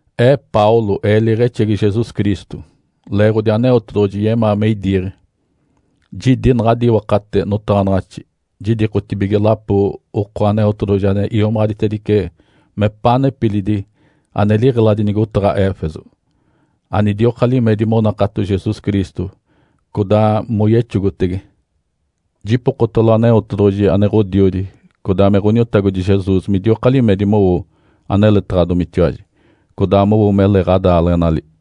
Ee Paulo, ee liiɡ̶exegi Jesus Cristo, leeɡ̶odi Aneotedoɡ̶oji yemaa me idiiɡ̶e, jidi naɡ̶adi iwakate notaɡ̶anaɡ̶axi, jidikotibige lapo oko Aneotedoɡ̶oji ane iomaɡ̶aditedice mepaa nepilidi ane liɡ̶eladi nigotaɡ̶a Éfeso, anidioka limedi monakato Jesus Cristo, codaa moyexogote. Jipokotalo Aneotedoɡ̶oji ane Ǥodiodi codaa me Ǥoniotagodi Jesus midioka limedi mowo aneletaɡ̶adomitiwaji, codaa mowo mele ɡ̶adaaleɡ̶enali.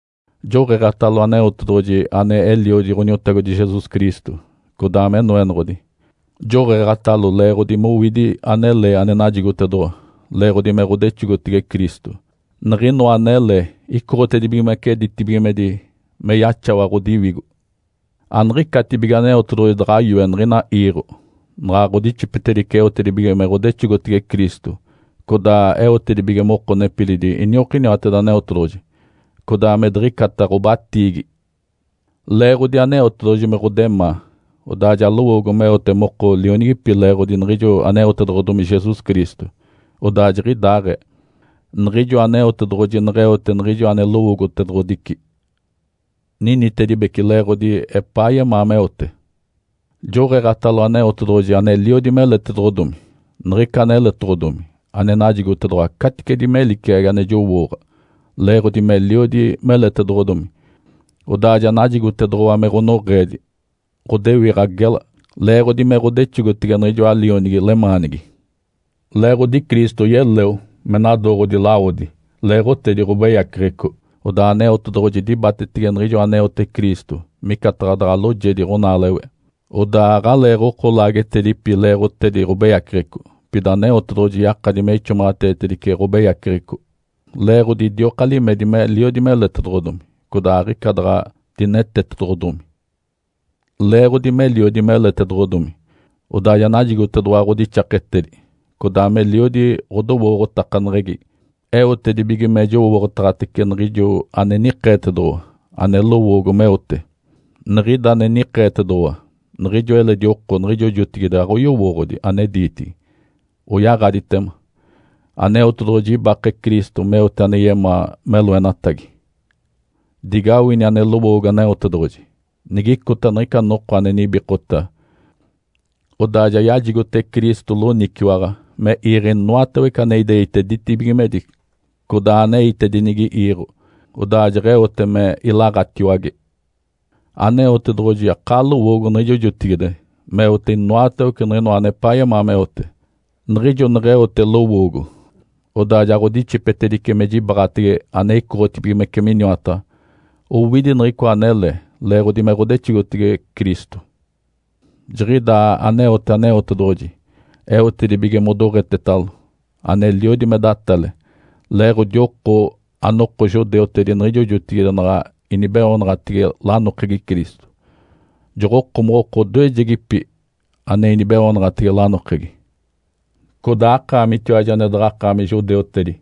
Joɡ̶eeɡ̶atalo Aneotedoɡ̶oji ane Eliodi Ǥoniotagodi Jesus Cristo, codaa me Noenoɡ̶odi. Joɡ̶eeɡ̶atalo leeɡ̶odi mowidi anele ane najigotedoɡ̶owa leeɡ̶odi me ɡ̶odexogotege Cristo. Niɡ̶inoa anele icoɡ̶otedibigimece ditibigimedi me yaxawa ɡ̶odiwigo. Aniɡ̶icatibige Aneotedoɡ̶oji daɡ̶a yoe niɡ̶ina iiɡ̶o, naɡ̶a ɡ̶odixipetedice eotedibige me ɡ̶odexogotege Cristo codaa eotedibige moko nepilidi iniokiniwateda Aneotedoɡ̶oji, codaa me diɡ̶icata ɡ̶obatiigi. Leeɡ̶odi Aneotedoɡ̶oji me ɡ̶odemaa, odaa ja lowoogo meote moko lionigipi leeɡ̶odi niɡ̶ijo aneotedoɡ̶odomi Jesus Cristo. Odaa jiɡ̶idaaɡ̶ee, niɡ̶ijo Aneotedoɡ̶oji neɡ̶eote niɡ̶ijo ane lowoogotedoɡ̶odici, ninitedibece leeɡ̶odi epaa yemaa meote. Joɡ̶eeɡ̶atalo Aneotedoɡ̶oji aneliodi meletedoɡ̶odomi. Niɡ̶ica aneletoɡ̶odomi ane najigotedoɡ̶owa caticedi me liciagi ane jowooɡ̶a. Leeɡ̶odi meliodi meletedoɡ̶odomi, odaa ja najigotedoɡ̶owa me ɡ̶onoɡ̶eedi, ɡ̶odewiɡ̶a gela, leeɡ̶odi me ɡ̶odexogotege niɡ̶ijoa Lionigi lemaanigi. Leeɡ̶odi Cristo yeleo me nadooɡ̶odi lawodi leeɡ̶otedi ɡ̶obeyaceɡ̶eco, odaa Aneotedoɡ̶oji dibatetege niɡ̶ijo aneote Cristo micataɡ̶a daɡ̶a loojedi ɡ̶onaalewe, odaa aɡ̶aleeɡ̶oko laagetedipi leeɡ̶otedi ɡ̶obeyaceɡ̶eco. Pida Aneotedoɡ̶oji yakadi me ixomaɡ̶ateetedice ɡ̶obeyaceɡ̶eco leeɡ̶odi idioka limedi meliodi meletedoɡ̶odomi, codaa aɡ̶ica daɡ̶a dinetetedoɡ̶odomi. Leeɡ̶odi meliodi meletedoɡ̶odomi, odaa ja najigotedoɡ̶owa ɡ̶odixaketedi, codaa meliodi ɡ̶odowooɡ̶otakaneɡ̶egi eotedibige me jowooɡ̶otaɡ̶atece niɡ̶ijo ane nikeetedoɡ̶owa, ane lowoogo meote. Niɡ̶ida ane nikeetedoɡ̶owa, niɡ̶ijo eledi oko niɡ̶ijo jotigide aɡ̶oyowooɡ̶odi ane diitigi, oyaɡ̶aditema. Aneotedoɡ̶oji ibake Cristo meote ane yemaa me loenatagi. Digawini ane lowoogo Aneotedoɡ̶oji. Nigicota niɡ̶ica noko ane nibikota, odaa ja yajigote Cristo loniciwaɡ̶a me iiɡ̶e inoatawece aneite ditibigimedi codaa aneitedinigi iiɡ̶o, odaa jeɡ̶eote me ilaɡ̶atiwage. Aneotedoɡ̶oji akaa lowoogo niɡ̶ijo jotigide, meote inoatawece niɡ̶inoa anepaa yemaa meote. Niɡ̶ijo neɡ̶eote lowoogo, odaa ja ɡ̶odixipetedice me jibaɡ̶atege ane icoɡ̶otibigimece miniwataɡ̶a owidi niɡ̶icoa anele leeɡ̶odi me ɡ̶odexogotege Cristo. Jiɡ̶idaa aneote Aneotedoɡ̶oji eotedibige modoɡ̶etetalo, aneliodi me datale, leeɡ̶odi oko anoko judeutedi niɡ̶ijo jotigide naɡ̶a inibeoonaɡ̶atege lanokegi Cristo. Joɡ̶okomoɡ̶oko odoejegipi ane inibeoonaɡ̶atege lanokegi. Codaa akaamitiwaji ane daɡ̶akaami judeutedi,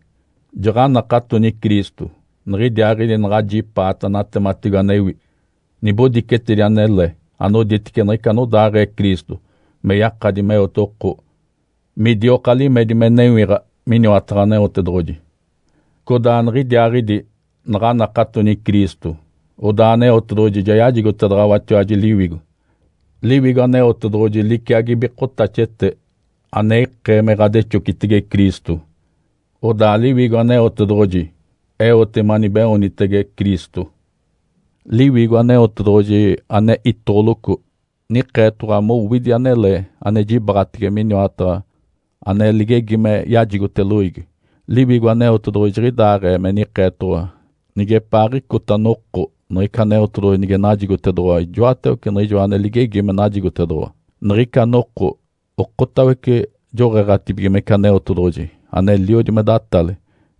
jaɡ̶anakatoni Cristo, niɡ̶idiaaɡ̶idi naɡ̶ajipaata natematigo anewi, nibodicetedi anele anoditece niɡ̶ica anodaaɡ̶ee Cristo me yakadi meote oko midioka limedi me newiɡ̶a miniwataɡ̶a Aneotedoɡ̶oji. Codaa niɡ̶idiaaɡ̶idi naɡ̶anakatoni Cristo, odaa Aneotedoɡ̶oji ja yajigotedaɡ̶awatiwaji Liwigo. Liwigo Aneotedoɡ̶oji liciagi bikotaxete ane ikee me ɡ̶adexocitege Cristo. Odaa Liwigo Aneotedoɡ̶oji eote manibeoonitege Cristo. Liwigo Aneotedoɡ̶oji ane itoɡ̶oloco nikeetoɡ̶owa mowidi anele ane jibaɡ̶atege miniwataɡ̶a ane ligegi me yajigote loiigi. Liwigo Aneotedoɡ̶oji jiɡ̶idaaɡ̶ee me nikeetoɡ̶owa nigepaaɡ̶icota noko niɡ̶ica Aneotedoɡ̶oji nige najigotedoɡ̶owa ijoatawece niɡ̶ijoa ane ligegi me najigotedoɡ̶owa. Niɡ̶ica noko okotawece joɡ̶eeɡ̶atibigimece Aneotedoɡ̶oji aneliodi me datale,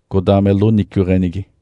codaa me loniciweɡ̶enigi.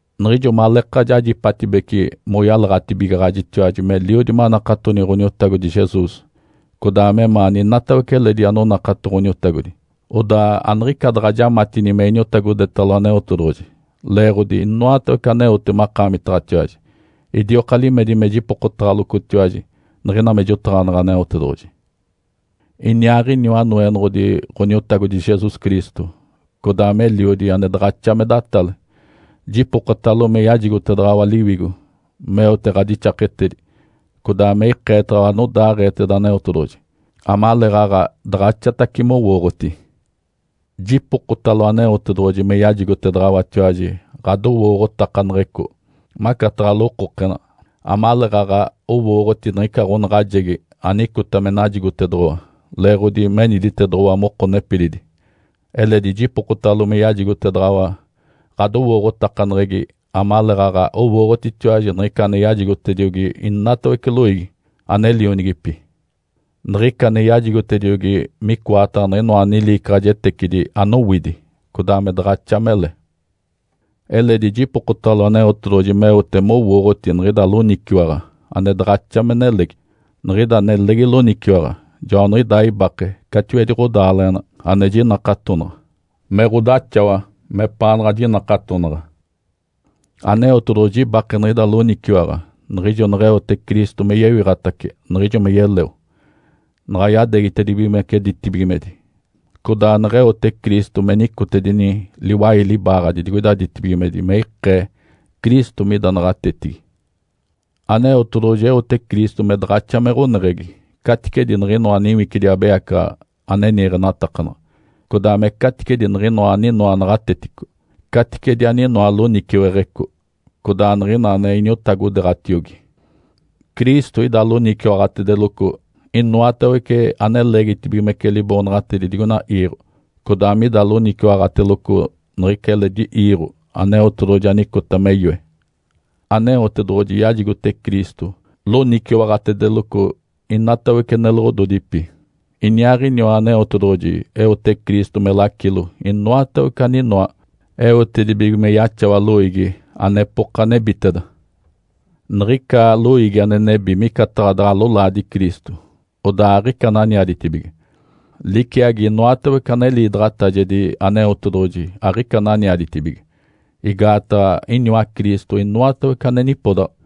Niɡ̶ijo maleeka jajipatibece moyalaɡ̶atibigaɡ̶ajitiwaji meliodi manakatoni Ǥoniotagodi Jesus, codaa memaani inatawece eledi anonakato Ǥoniotagodi, odaa aniɡ̶ica daɡ̶a jamatini me iniotagodetalo Aneotedoɡ̶oji leeɡ̶odi inoatawece aneote makaamitaɡ̶atiwaji. Idioka limedi me jipokotaɡ̶alocotiwaji niɡ̶ina me jotaɡ̶aneɡ̶e Aneotedoɡ̶oji. Iniaaɡ̶iniwa Noenoɡ̶odi Ǥoniotagodi Jesus Cristo, codaa me Eliodi ane daɡ̶axa me datale. Jipokotalo me yajigotedaɡ̶awa Liwigo meote ɡ̶adixaketedi, codaa me ikeetaɡ̶awa anodaaɡ̶eeteda Aneotedoɡ̶oji, amaleeɡ̶aɡ̶a daɡ̶axatacice mowooɡ̶oti. Jipokotalo Aneotedoɡ̶oji me yajigotedaɡ̶awatiwaji ɡ̶adowooɡ̶otakaneɡ̶eco, macataɡ̶a lokokena, amaleeɡ̶aɡ̶a owooɡ̶oti niɡ̶ica ɡ̶onaɡ̶ajegi anicota me najigotedoɡ̶owa leeɡ̶odi meniditedoɡ̶owa moko nepilidi. Eledi jipokotalo me yajigotedaɡ̶awa ɡ̶adowooɡ̶otakaneɡ̶egi amaleeɡ̶aɡ̶a owooɡ̶otitiwaji niɡ̶ica ane yajigotediogi inatawece loiigi, ane lionigipi. Niɡ̶ica ane yajigotediogi micoataɡ̶a niɡ̶inoa liicaɡ̶ajetecidi anowidi, codaa me daɡ̶axa mele. Eledi jipokotalo Aneotedoɡ̶oji meote mowooɡ̶oti niɡ̶ida loniciwaɡ̶a ane daɡ̶axa me nelegi. Niɡ̶ida nelegi loniciwaɡ̶a joaniɡ̶idaa ibake catiwedi ɡ̶odaaleɡ̶ena ane jinakatonaɡ̶a, me ɡ̶odaxawa mepaanaɡ̶a jinakatonaɡ̶a. Aneotedoɡ̶oji ibake niɡ̶ida loniciwaɡ̶a niɡ̶ijo neɡ̶eote Cristo me yewiɡ̶atace niɡ̶ijo me yeleo, naɡ̶a yadeegitedibigimece ditibigimedi, codaa neɡ̶eote Cristo me nicotedini liwai libaaɡ̶adi digoida ditibigimedi me ikee Cristo mida naɡ̶atetigi. Aneotedoɡ̶oji eote Cristo me daɡ̶axa me ɡ̶oneɡ̶egi caticedi niɡ̶inoa niwicidi abeyacaɡ̶aɡ̶a ane niiɡ̶enatakanaɡ̶a, codaa me caticedi niɡ̶inoa aninoa naɡ̶atetico, caticedi aninoa loniciweɡ̶eco, codaa niɡ̶ina ane iniotagodeeɡ̶atiogi. Cristo ida loniciwaɡ̶atedeloco inoatawece ane leegitibigimece liboonaɡ̶atedi digoina iiɡ̶o codaa mida loniciwaɡ̶atedeloco niɡ̶ica eledi iiɡ̶o Aneotedoɡ̶oji anicota me yoe. Aneotedoɡ̶oji yajigote Cristo loniciwaɡ̶atedeloco inatawece neloɡ̶ododipi. Iniaaɡ̶iniwa Aneotedoɡ̶oji eote Cristo me lacilo inoatawece aninoa eotedibige me yaxawa loiigi anepoka nebiteda. Niɡ̶ica loiigi ane nebi micataɡ̶a daɡ̶a lolaadi Cristo, odaa aɡ̶ica ananiaditibige, liciagi inoatawece ane liidaɡ̶atajedi Aneotedoɡ̶oji aɡ̶ica ananiaditibige, igaataɡ̶a iniwa Cristo inoatawece ane nipodaɡ̶a.